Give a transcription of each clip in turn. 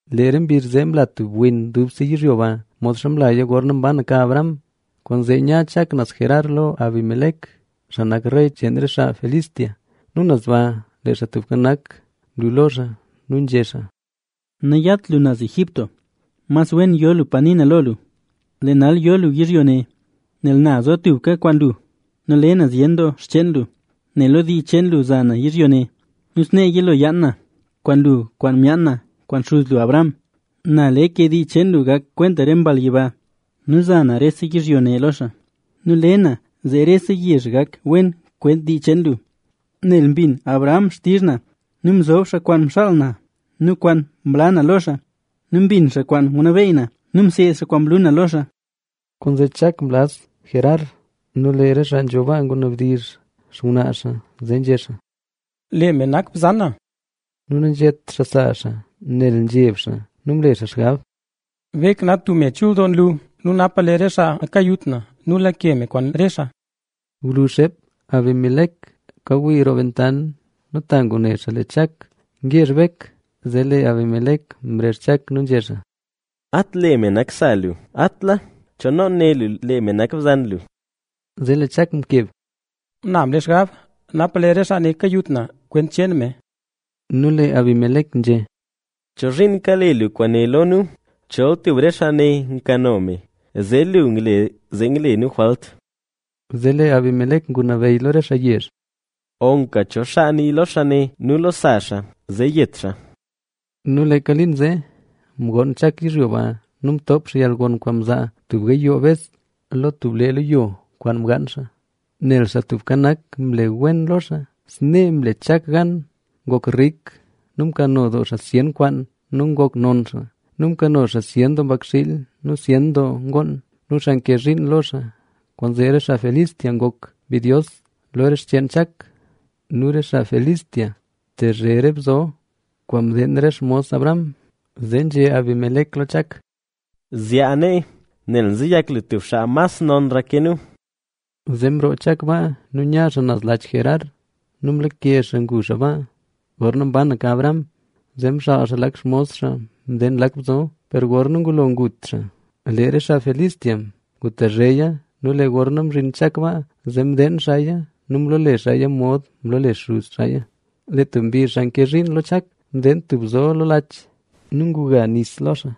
Lee re mbizh zee mla tub win dubse yizhyo ba, modxa mlaya gorna mbanaka Abraham. Kwaanzee nya Chak naz Gerar lo Abimelec, xaa nak rey cheen re xaa Filistea. Nu naz ba lee Xaa Tubka Nak mlu lo xaa nu nzhé xaa: —Nayat lu naz Egipto; mas wen yo lu pa nii na lo lu. Lee nal yo lu yizhyo ne, nel na zo tubka kwaan lu. Nu le na zyen doo xcheen lu, nel lo dii cheen lu za na yizhyo ne. Nu snee yilo yaan na kwaan lu kwaan myaan na kwaan xuz lu Abraham. Na le ke dii cheen lu gak kwent re mbal yiba nu za na rese yizhyo ne lo xaa. Nu le na zee rese yezh gak wen kwent dii cheen lu, nel mbin Abraham xtizh na nu mzob xaa kwaan mxaal na nu kwaan mla na lo xaa; nu mbin xaa kwaan ngunabeyy na nu mseed xaa kwaan mlu na lo xaa. Kwaanzee Chak mlaz Gerar. Nu lee re xaa nzho baa ngunabdizh xngwnaa xaa, zee nzhé xaa: —Lee me nak bzan na. Nu nanzhét xaa sa xaa nel nzheb xaa. Nu mle xaa xgab: “Bek nak tub me chul doo nlu nu napa lee re xaa kayut na nu lake me kwaan re xaa”. Gwluzh xeep, Abimelec kawii roo bentant nu ta ngune xaa lee Chak ngezh Bek. Zee lee Abimelec mrezh Chak nu nzhé xaa: —¡At lee me nak sa lu! ¿Cho noon né lu lee me nak bzan lu? Nu lee Chak mkeb: —Na mle xgab, napa lee re xaa ne kayut na kwent cheen me. Nu lee Abimelec nzhé: —¿Chozhiin kale lu kwaane lo nu? Chol tub re xaa ne nkano me, zee lu ngle zee ngle nu jwalt. Zee lee Abimelec ngunabeyy lo re xaa yezh: —Loka cho xaa nii lo xaa ne nu lo sa xaa, zee yet xaa. Nu leeka liin zee, mgoon Chak yizhyo ba nu mtoop xaa yalgon kwaan mzaa tub gayoo bes lo tub ble kwaan mgaan xaa, nel Xaa Tubka Nak mle wen lo xaa. Snee mle Chak gan ngok rik nu mkano doo xaa zyen kwaan nu ngok non xaa. Nu mkano xaa zyen doo mbakxiil nu zyen doo ngoon nu xaa nke zhiin lo xaa. Kwaanzee re xaa Filistea ngok mbidyos lo re xcheen Chak. Nu lee re xaa Filistea mtezhe re bzo kwaan mdeen re xmos Abraham. Zee nzhé Abimelec lo Chak: —Zyaa nee, nel nzeyak lu tub xaa mas nonra ke nu. Zee mroo Chak baa nu nya xaa naz Laach Gerar nu mlake xaa ngu xaa baa. Gorna mbanaka Abraham, zee mxaal xaa lak xmos xaa mdeen lak bzo, per gorna ngulo ngut xaa, lee re xaa Filistea ngutezheya. Nu lee gorna mzhin Chak baa, zee mdeen xaaya nu mloole xaaya mod mloole xuz xaaya. Lee tub mbizh, xaa nke zhiin lo Chak mdeen tub bzo lo tub laach nu nguga nis lo xaa.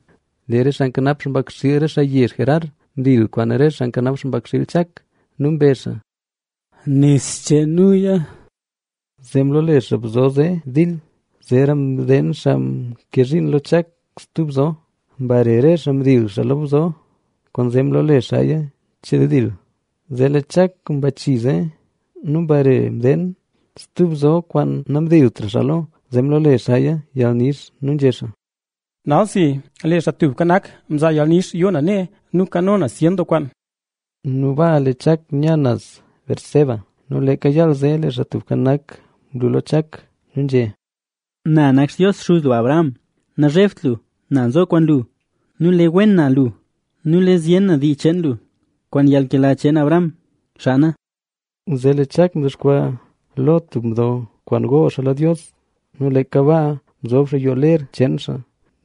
Lee re xaa nkanap xpakxiil xaa yezh Gerar, mdil kwaan re xaa nkanap xpakxiil Chak nu mbezh xaa: —¡Nis cheen nuya! Zee mloole xaa bzo zee “Dil”. Zeera mdeen xaa nke zhiin lo Chak stub bzo. Mbare re xaa mdil xaa lo bzo, kwaanzee mloole xaaya “Cheldil”. Zee lee Chak mbachii zee nu mbare mdeen stub bzo kwaan namdiltra xaa lo, zee mloole xaaya “Yalnix”. Nu nzhé xaa: —Nal si, lee Xaa Tubka Nak mzaa yalnix yoo na nee nu kano na zyen doo kwaan. Nu baa lee Chak nya naz Beerseba. Nu leeka yaal zee, lee Xaa Tubka Nak mlu lo Chak nu nzhé xaa: Na nak Xtios xuz lu, Abraham. Nazhebt lu, na nzo kwaan lu. Nu le wen na lu nu le zyen na dii cheen lu kwaan yalnkela cheen Abraham, xaa na. Zee lee Chak mdexkwaa lo tub mdo kwaan gool xaa lo Dios. Nu leeka baa mzob xaa yoo ler cheen xaa.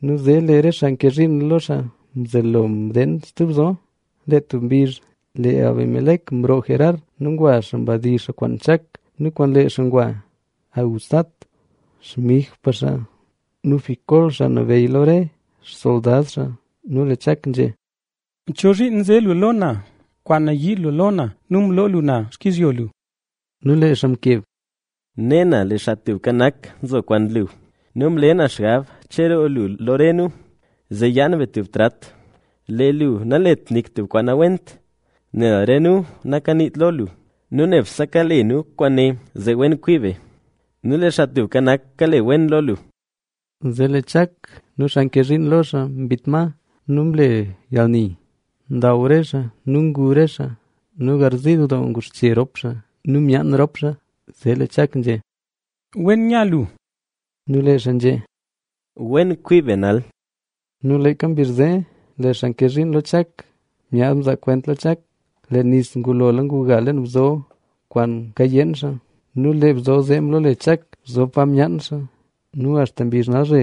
Nu zee lee re xaa nke zhiin lo xaa mzelo mdeen stub bzo. Lee tub mbizh, lee Abimelec mroo Gerar nu ngwa xaa mdizh xaa kwaan Chak nu kwaan lee xaa ngwa Ahuzat, xmigpa xaa nu Ficol, xaa nabeyy lo re xsoldad xaa. Lee Chak nzhé: —¿Chozhiin nze lu lo na? Kwaan nayii lu lo na nu mloo lu na xkizhyo lu. Nu lee xaa mkeb: —Ne na lee Xaa Tubka Nak nzo kwaan lu. Nu mle na xgab cheroo lu lo re nu, zee yaan be tub trat. Lee lu nalet nik tub kwaan nawent, nel re nu nakaniit lo lu. Nu nebse kale nu kwaan, zee wen kwii be. Nu lee Xaa Tubka Nak kale wen lo lu. Zee lee Chak nu xaa nke zhiin lo xaa mbit ma nu mle yalni. Ndaw re xaa nu ngu re xaa. Nu garziil doo nguxche rop xaa nu myaan rop xaa. Zee lee Chak nzhé: —Wen nya lu. Nu lee xaa nzhé: —Wen kwii be nal. Nu leeka mbizh zee, lee xaa nke zhiin lo Chak myaad mzaa kwent lo Chak, lee nis ngulola nguga leen bzo kwaan kayeen xaa. Nu lee bzo zee mloole Chak “Bzo pa myaan xaa”. Nu axta mbizh nalzhe,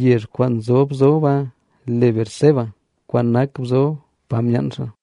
yezh kwaan nzob bzo baa le Beerseba, kwaan nak Bzo pa myaan xaa.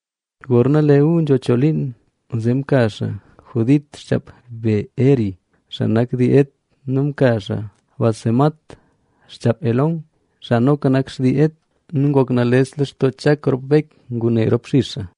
Gorna lee Esaú nzho choo liin, zee mka xaa Judit, xchaap Beeri, xaa nak dii Het nu mka xaa Basemat, xchaap Elón, xaa noka nak xtii Het. Nu ngok nales lextoo Chak rop Bek ngune rop xix xaa.